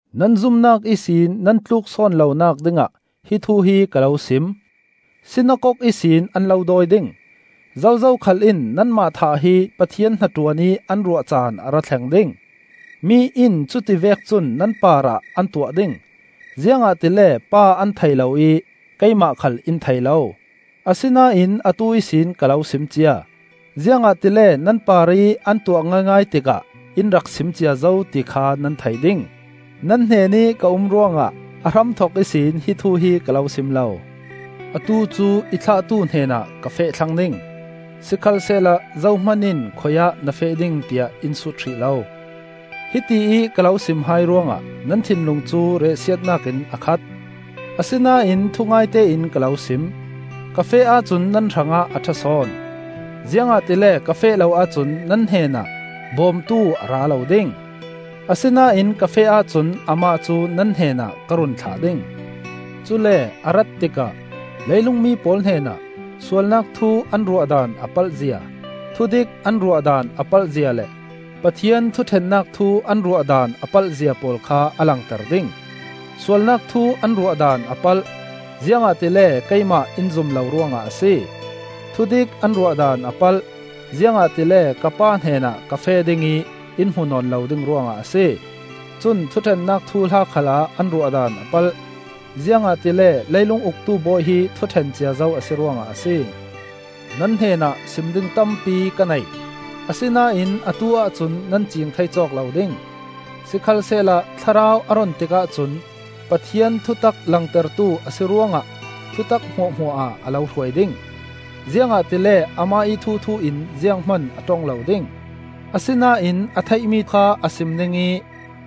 “Nan zumnak ihsin nan tluksawn lonak dingah hi thu hi ka lo sim. Sinakok ihsin an lo dawi ding; zozo khal in nanmah thah hi Pathian hnaṭuan ih an ruah caan a ra thleng ding. Mi in cuti vek cun nan parah an tuah ding, ziangahtile Pa an thei lo ih keimah khal in thei lo. Asinain atu ihsin ka lo sim cia, ziangahtile nan parih an tuah ngaingai tikah in rak sim cia zo ti kha nan thei ding. Thlarau Thianghlim Hnaṭuannak “Nan hnenih ka um ruangah a hramthok ihsin hi thu hi ka lo sim lo. Atu cu i thlahtu hnenah ka feh thlang ding; sikhalsehla zohman in khuiah na feh ding tiah in sut hrih lo. Hitiih ka lo sim hai ruangah nan thinlung cu riahsiatnak in a khat. Asinain thungaite in ka lo sim: ka feh ahcun nan hrangah a ṭha sawn, ziangahtile ka feh lo ahcun nan hnenah Bawmtu a ra lo ding. Asinain ka feh ahcun amah cu nan hnenah ka run thlah ding. Cule a rat tikah leilung mi pawl hnenah sualnak thu an ruahdan a palhzia, thudik an ruahdan a palhzia le Pathian thuṭhennak thu an ruahdan a palhzia pawl kha a langter ding. Sualnak thu an ruahdan a palh, ziangahtile keimah in zum lo ruangah a si. Thudik an ruahdan a palh, ziangahtile ka Pa hnenah ka feh ding ih in hmuh nawn lo ding ruangah a si. Cun thuṭhennak thuhla khalah an ruahdan a palh, ziangahtile leilung uktu bawi hi thuṭhen cia zo a si ruangah a si. “Nan hnenah sim ding tampi ka nei, asinain atu-ah cun nan ciing thei cawk lo ding. Sikhalsehla Thlarau a run tikah cun Pathian thutak langtertu a si ruangah thutak hmuahhmuah ah a lo hruai ding. Ziangahtile amah ih thuthu in zianghman a ṭong lo ding; asinain a theihmi kha a sim ding ih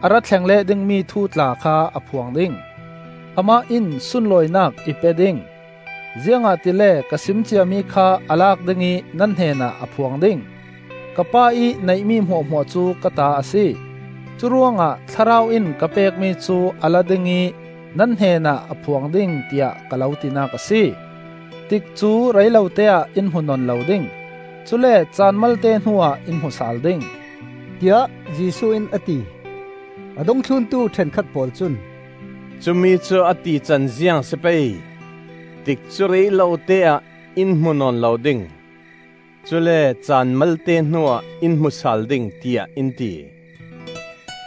a ra thleng leh dingmi thu tla kha a phuang ding. Amah in sunlawinak i pe ding, ziangahtile ka sim ciami kha a lak ding ih nan hnenah a phuang ding. Ka Pa ih neihmi hmuahhmuah cu ka ta a si, curuangah Thlarau in ka pekmi cu a la ding ih nan hnenah a phuang ding, tiah ka lo tinak a si. “Tikcu rei lote-ah in hmu nawn lo ding; cule caan malte hnuah in hmu sal ding,” tiah Jesuh in a ti. A dungthluntu ṭhenkhat pawl cun, “Cumi cu a tican ziang a si pei? Tikcu rei lote-ah in hmu nawn lo ding; cule caan malte hnuah in hmu sal ding, tiah in ti.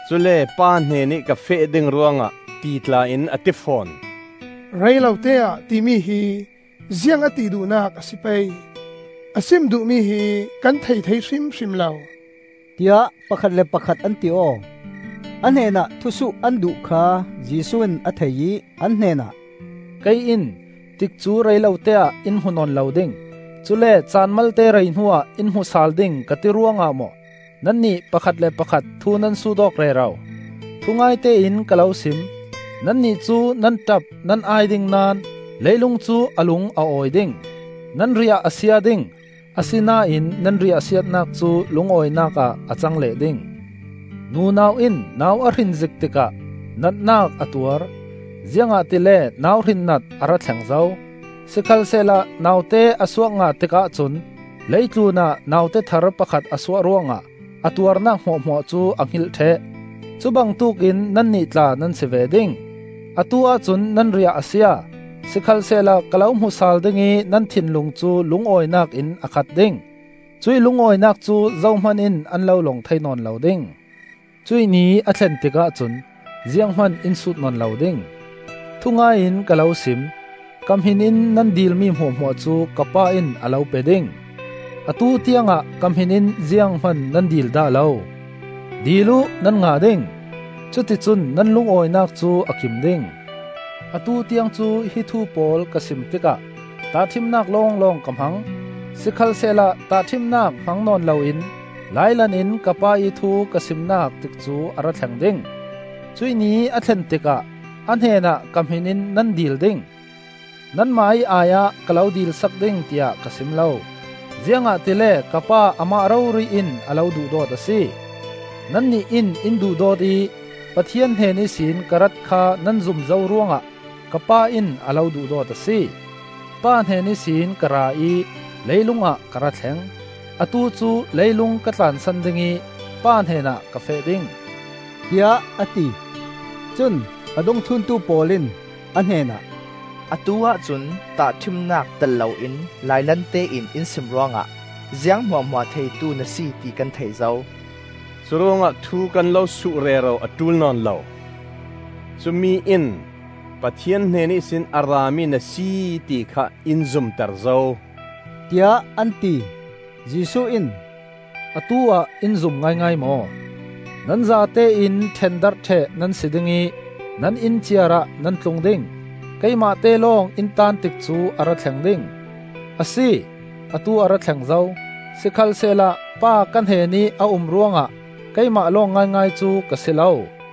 Cule ‘Pa hnenih ka feh ding ruangah,’ ti tla in a ti fawn. ‘Rei lote-ah,’ timi hi ziang a ti duhnak a si pei? A sim duhmi hi kan thei thei hrimhrim lo!” tiah pakhat le pakhat an ti aw. A hnenah thusuh an duh kha Jesuh in a thei ih an hnenah, “Kei in ‘Tikcu rei lote-ah in hmu nawn lo ding; cule caan malte rei hnuah in hmu sal ding,’ ka ti ruangah maw nannih pakhat le pakhat thu nan sut awk rero? Thungaite in ka lo sim: nannih cu nan ṭap nan ai ding naón leilung cu a lung a awi ding; nan riah a sia ding, asinain nan riahsiatnak cu lungawinak ah a cang leh ding. Nunau in nau a hrin zik tikah natnak a tuar, ziangahtile nauhrin nat a ra thleng zo; sikhalsehla naute a suak ngah tikah cun lei tlunah naute thar pakhat a suah ruangah a tuarnak hmuahhmuah cu a hngilh ṭheh. Cubangtuk in nannih tla nan si ve ding: atu-ah cun nan riah a sia, sikhalsehla ka lo hmu sal ding ih nan thinlung cu lungawinak in a khat ding; cuih lungawinak cu zohman in an lo lawng thei nawn lo ding. Cuih ni a thlen tikah cun zianghman in sut nawn lo ding. Thungai in ka lo sim: ka hmin in nan dilmi hmuahhmuah cu ka Pa in a lo pe ding. Atu tiangah ka hmin in zianghman nan dil dah lo. Dil uh nan ngah ding; cuticun nan lungawinak cu a kim ding. “Atu tiang cu hi thu pawl ka sim tikah tahṭhimnak lawnglawng ka hmang. Sikhalsehla tahṭhimnak hmang nawn loin lailan in ka Pa ih thu ka simnak tikcu a ra thleng ding. Cuih ni a thlen tikah a hnenah ka hmin in nan dil ding; nanmah ih ai-ah ka lo dilsak ding tiah ka sim lo; ziangahtile ka Pa amah rori in a lo duhdawt a si. Nannih in in duhdawt ih Pathian hnen ihsin ka rat kha nan zum zo ruangah ka Pa in a lo duhdawt a si. Pa hnen ihsin ka ra ih leilungah ka ra thleng. Atu cu leilung ka tlansan ding ih Pa hnenah ka feh ding,” tiah a ti. Cun a dungthluntu pawl in a hnenah, “Atu-ah cun tahṭhimnak telh loin lailante in in sim ruangah, ziang hmuahhmuah theitu na si, ti kan thei zo; curuangah thu kan lo suh rero a ṭul nawn lo. Cumi in Pathian hnen ihsin a rami na si, ti kha in zumter zo,” tiah an ti. Jesuh in, “Atu-ah in zum ngaingai maw? Nan zatein ṭhendarh ṭheh nan si ding ih nan inn ciarah nan tlung ding; keimahte lawng in taan tikcu a ra thleng ding; a si, atu a ra thleng zo. Sikhalsehla Pa ka hnenih a um ruangah keimah lawng ngaingai cu ka si lo.